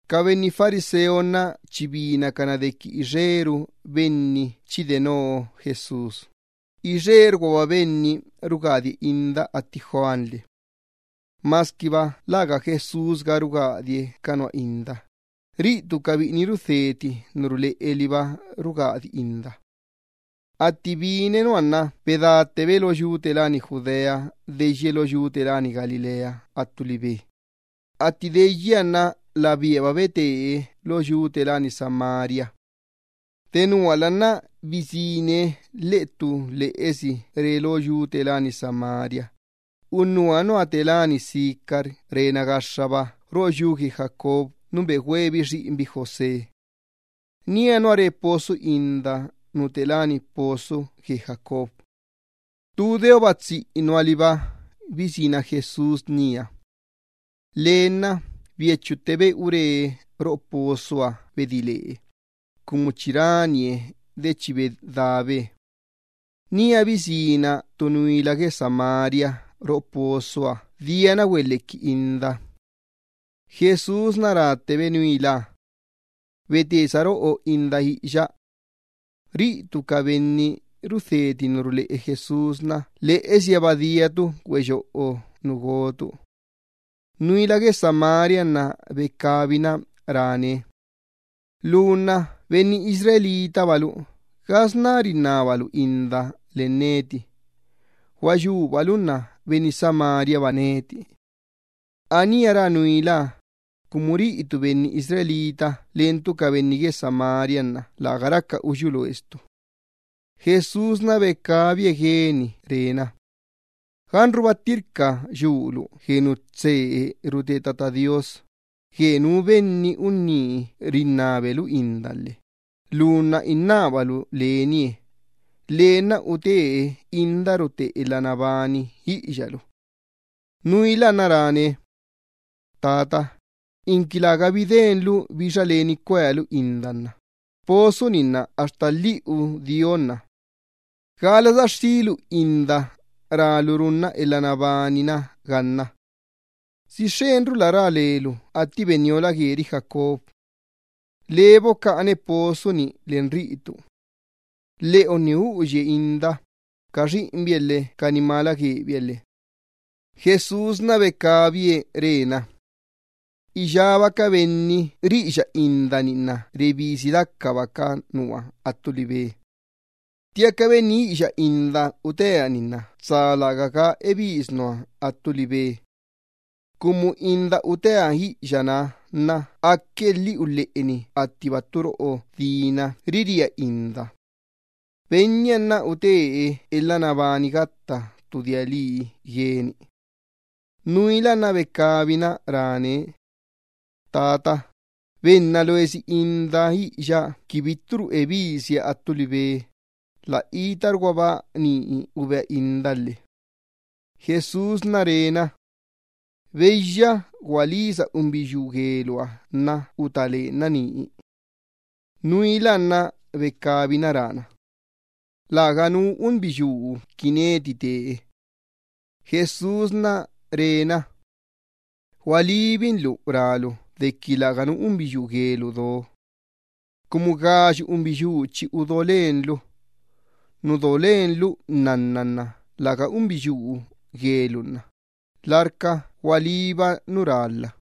Ca benni fariseo chi binacana dequi ixeru benni chi denoo Jesús, ixerguaba benni rugadie inda atti Juan lhe. (Masquiba läga Jesús ga rugadie ca nua inda, ca biꞌini rudheti ca tisa ruleꞌe Benniha liba rugadi inda.) Atti bine nua nna bedáttebe lo yu gue Judea deyye lo yu gue Galilea attu libe. Atti deyya Benniha nna labíaba bete lo yu gue Samaria. Denuala nna bisíne lheꞌe ttu lheꞌesi re lo yu gue Samaria, unnuha nua te láni Sicar rena gaxxaba roꞌo yu gue Jacob nu begüeebi xiꞌinbi José. Nía nua re pozo inda nu te láni pozo gue Jacob. Tu deoba tsiꞌinuha liba bisína Jesús nía. Lee nna biachuttebe ure roꞌo pozoha bedí lee, cumu chi ranie de yuꞌe neda. Nía bisína ttu nuila gue Samaria roꞌo pozoha diana güelhequi inda. Jesús ráttebe nuilaha: —Bete saroꞌo inda iꞌiya. Ca biꞌini rudheti ca tisa ruleꞌe Jesús lheꞌesihaba diacabi güeyoꞌo nu gocabi. Nuila gue Samariaha nna becabina rána Benniha: —Lu nna benni Israelba lu, ¿gasná rinnabalu inda len neti? Gua yubalu nna benni Samariaba neti. (Anía rá nuilaha, cumu ca benni Israel läga raca uyú loescani leni ca benni Samaria.) Jesús becabie gueni re na: —Ganruba ttirca yulu gue nu tsee rute Tata Do Iyyabaaha, gue nú benni unní rinnabe lu inda lhe lu nna innábalu lenie, lee nna utee inda rute elha nabani iꞌiyalu. Nuilaha nna ráne: —Tata, inqui lägabi denlu bixa leni cuealu inda nna pozo-ni nna axta lhiꞌu dionna. ¿Gala saxxílu inda rálu runna elha nabani-na ganna? ¿Si xxenrula rá lelu atti benniola gueri Jacob? Labi bocaꞌanbi pozo-ni len riꞌitu. Lheꞌonni uꞌuya bi inda, ca xiꞌinbiha lhe ca nimala guebiha lhe. Jesús becabie re na: —Iyába ca benni riꞌiya inda-ni nna rebisi dacaba ca nua attu libe. Ttiaca benni iꞌiya inda utea-ni nna tsa lärgaga ebis nua attu libe. Cumu inda utea iꞌiyanaha aque lhiꞌu lheꞌeni attiba ttu roꞌo dina riría inda. Benniha nna utee elha nabani gatta ttu dia lii gueni. Nuilaha nna becabina ráne: —Xa Tata, benna loesi indaha iꞌiya qui bitturu ebisia attu libe, lä itarguaba ni ubea inda lhe. Jesús re na: —Beyya, gualisa unbiyuu gueluha nna utá lenna nii. Nuilaha nna becabina rána: —Läganu unbiyuu qui neti te. Jesús re na: —Gualíbinlu rálu dequi läganu unbiyuu guelu do. Cumu gayu unbiyuu chi udo lenlu. Nu do len lu nnanna nna läga unbiyuu guelu unná, larca gualíba nu rálha.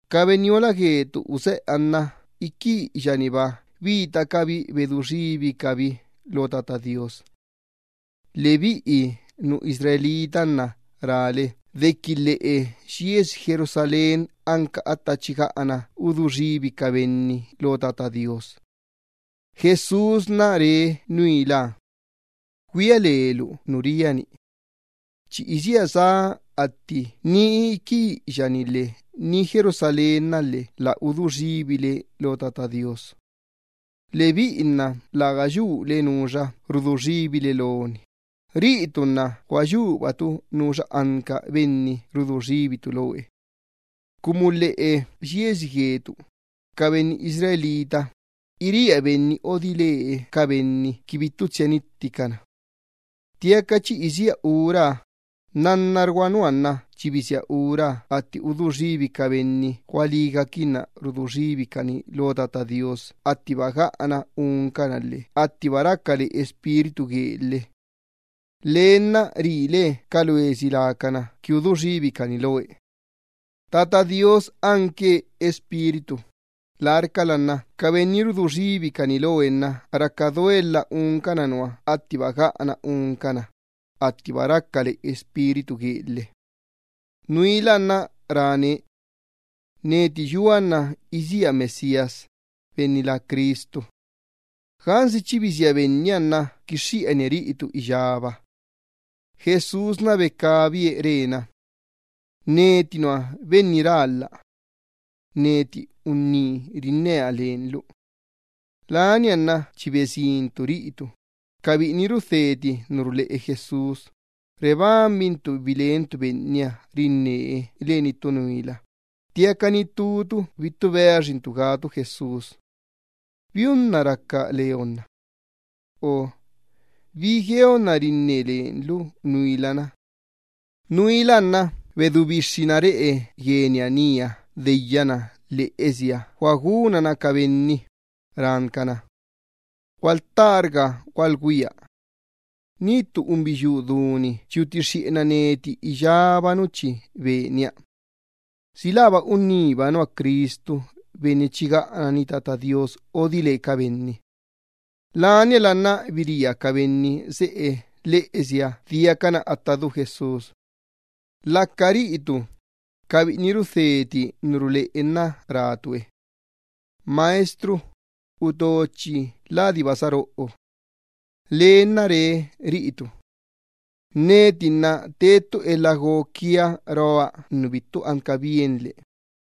Ca benniola guetu useꞌeha nna iqui iꞌiya-niba bitacabi ulequixxencabi Tata Do Iyyabaaha. Lebiꞌi nu Israel nna rále dequi lheꞌe yiesi Jerusalén anca atta chi gaꞌana cuequi xxeni ca benni Tata Do Iyyabaaha. Jesús becabie re nuilaha: —Güia lelu nu ria-ni. Chi isía sá atti ni iqui iꞌiya-ni lhe ni Jerusalén-na lhe lä udú xibile qui cuequixxenle Tata Do Iyyabaaha. Lebiꞌi nna läga yule nuxa rudú xibile loni, riꞌitu nna gua yubatu nuxa anca Benni cuequixxentu lee. Cumu lheꞌe yiesi gue ca benni Israel, iría Benni odile ca benni qui bittu tsia nitticana. Ttiaca chi isía uraha, nnannargua nua nna chi bisía ura atti cuequi xen ca benni gualígaquinna cuequi xencana Tata Do Iyyabaaha attiba gaꞌana uncana lhe attiba raca le Espíritu guee lhe. Lee nna rile ca loesi lacana qui cuequixxencana itú iqui itú lecani lee. Tata Do Iyyabaaha anque Espíritu, larcala nna ca benni ribequixxencane nna raca duelha uncan nua attiba gaꞌana uncana, attiba raca le Espíritu guee lhe. Nuilaha nna ráne: —Neti yua nna isía Mesías (benni lá Cristu). Gansi chi bisía Benniha nna quixxiꞌanie riꞌitu iyába. Jesús becabie re na: —Neti nua Benni rálha. Neti unní rinnea len lu. Unnuhaba raca nna atti besin ca biꞌini rudheti ca tisa ruleꞌe Jesús, lacabi nna bebanbaquinbi bilencabi Benniha rinnee len ttu nuila, ttiaca ni ttucabi bittu beaxiquinbi gácabi Jesús: “¿Biunna raca leonna? O ¿Bi gueonna rinne lenlu nuila-na?” Nuilaha nna bedú bixxina reꞌe gueniha nía atti deyyatttebana lheꞌesiha guagunana ca benni, rán cana: —Gualtárga gualgüia. Ni ttu unbiyuu du-ni chi utixxiꞌenna neti iyába nu chi benia. ¿Si läba unníba nua Cristu Benni chi gaꞌanani Tata Do Iyyabaaha odile ca benni? Laniala nna biría ca benni seꞌe lheꞌesiha diacana atta du Jesús. Laca ca biꞌini rudheti ca tisa ruleꞌe nna rácabi Benniha: —Maestro, uto chi ladiba saroꞌo. Beniha nna re ca biꞌiniha: —Neti nna te ttu elha go quia roa nu bittu anca bienle.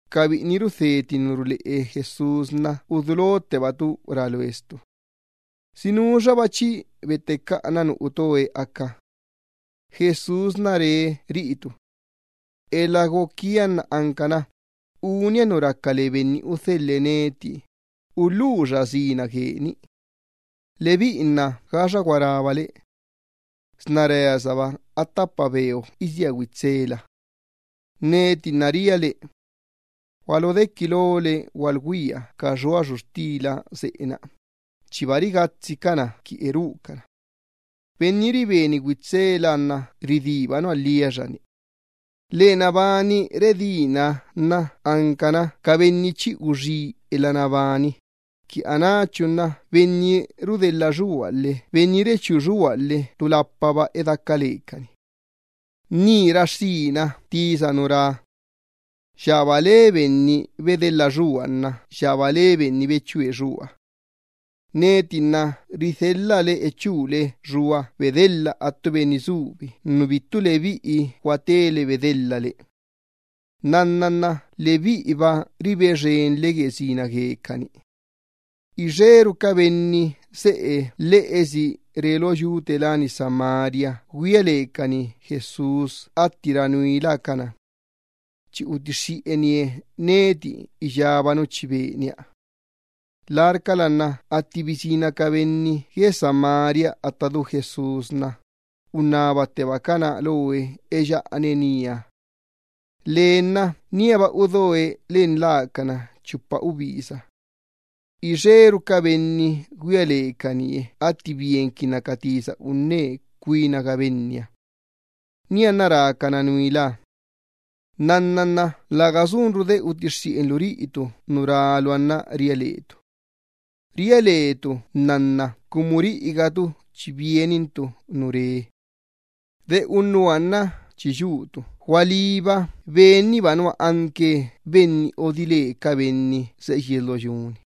Ca biꞌini rudheti ca tisa ruleꞌe Jesús, udulottebacabi rá loescabi: —¿Si nuxaba chi bettecaꞌana nu uto Benni aca? Jesús re ca biꞌiniha: —Elha go quia nna ancana unia nu raca le Benni udhelhe neti, ulhuxa sina guee-ni lhe. Lebiꞌi nna gaxa gua rábale: “Sna reasaba a ttapa beo isía güitsela.” Neti nna ria le: Gualodequi lole gualugüia ca xua xuxtila seꞌe-na, chiba rigatsicana qui erúcana. Benni ribeni güitsela nna ridíba nua lhiaxani. Lena bani redínaha nna ancana ca benni chi uxí elha nabani gatta ttu dia lii guecani, qui anáchu nna benni rudelha xua lhe benni rechú xua lhe ttulapaba edaca lecani. Ni raxxína tisa nu rá: “Yaba le benni bedelha xua nna yaba le benni bechú xua.” Neti nna ridhelha le echúle xua bedelha attu benni subi nu bittu lebiꞌi guatele bedelhale. Nnanna nna lebiꞌiba ribe xenle gue sina guecani. Ixeru ca benni seꞌe lheꞌesi re lo yu gue Samaria güia lecani Jesús atti rá nuilaha cana: “Ben-na chi utixxiꞌenie neti iyába nu chi benia.” Larcala nna atti bisína ca benni gue Samaria atta du Jesús, unnabattebacana lo Benniha eyaꞌane nía. Lee nna níaba udoe len lacana chupa ubisa. Ixeru ca benni güia lecanie atti bienquinna ca tisa unne cuinaga Benniha. Nianna, rácana nuilaha: —Nnanna nna läga sunru de utixiꞌenlu riꞌitu nu ráluha nna ria letu. Ria letu nnanna cumu riꞌigatu chi bienintu nu rá Ben-na. De unnuha nna chi yutu gualíba Ben-niba nua anque Benni odile ca benni seꞌe yies lo yu-ni.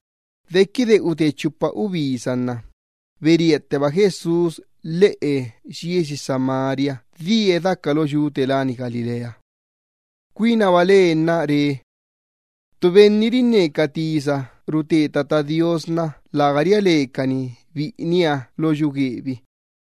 Dequide ute chupa ubisa nna, beríatteba Jesús lheꞌe yiesi Samaria die daca lo yu gue Galilea. Cuinaba lee nna re: “Ttu benni rinne ca tisa rute Tata Do Iyyabaaha, läga ria lecani biꞌiniha lo yu guebi.”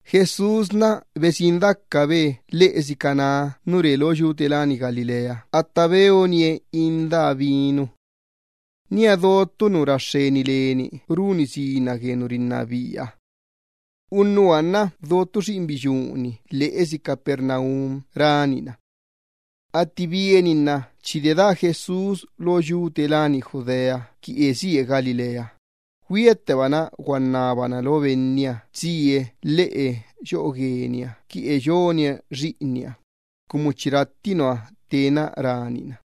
Jesús besin dacabe lheꞌesi Caná nu re lo yu gue Galilea atta beonie indaha vinu. Nía do ttu nu lo runi sina gue nu rinnabiaha. Unnuha nna do ttu xiꞌinbiyuu-ni lheꞌesi Capernaum ranina. Atti bieninna chi dedaa Jesús lo yu gue Judea qui esíe Galilea, güiattebana guannabana lo Benniha tsie lheꞌe yoꞌo gueniha qui eyonie xiꞌinniha, cumu chi ratti nua tena ranina.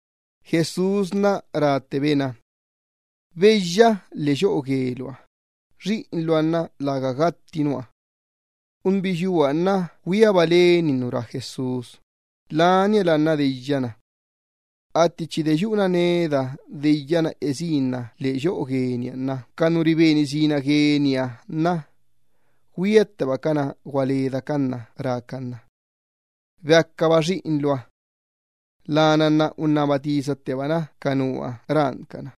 Jesús ráttebe na. —Beyya lheꞌe yoꞌo gueluha, xiꞌinluha nna läga gatti nua. Unbiyuuha nna güiaba leni nu rá Jesús, laniala nna deyyana. Atti chi deyuꞌuna neda deyyana esínna lheꞌe yoꞌo gueniha nna ca nu riben sina gueniha nna güiattebacana gualedacan na rácan na: —¡Beacaba xiꞌinluha! Lana nna unnaba tisattebana ca nua rán cana: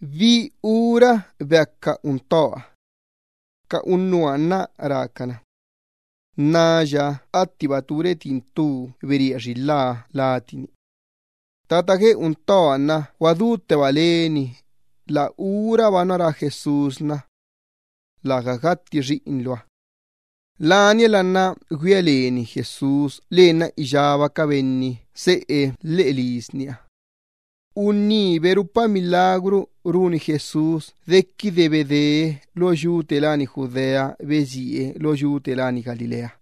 —¿Bi ura beaca untoha? Ca unnuha nna rácana: —Nnaya attiba tu retin ttu bería xilhá cuerpu gueni. Tata gue untoha nna guadútteba leni, la uraba nua rá Jesús na: “Läga gatti xiꞌinluha.” Laniala nna güia leni Jesús lenna iyába ca benni seꞌe lheꞌe lisniha. Unní berupa milagru runi Jesús dequide bedee lo yu gue Judea besíe lo yu gue Galilea.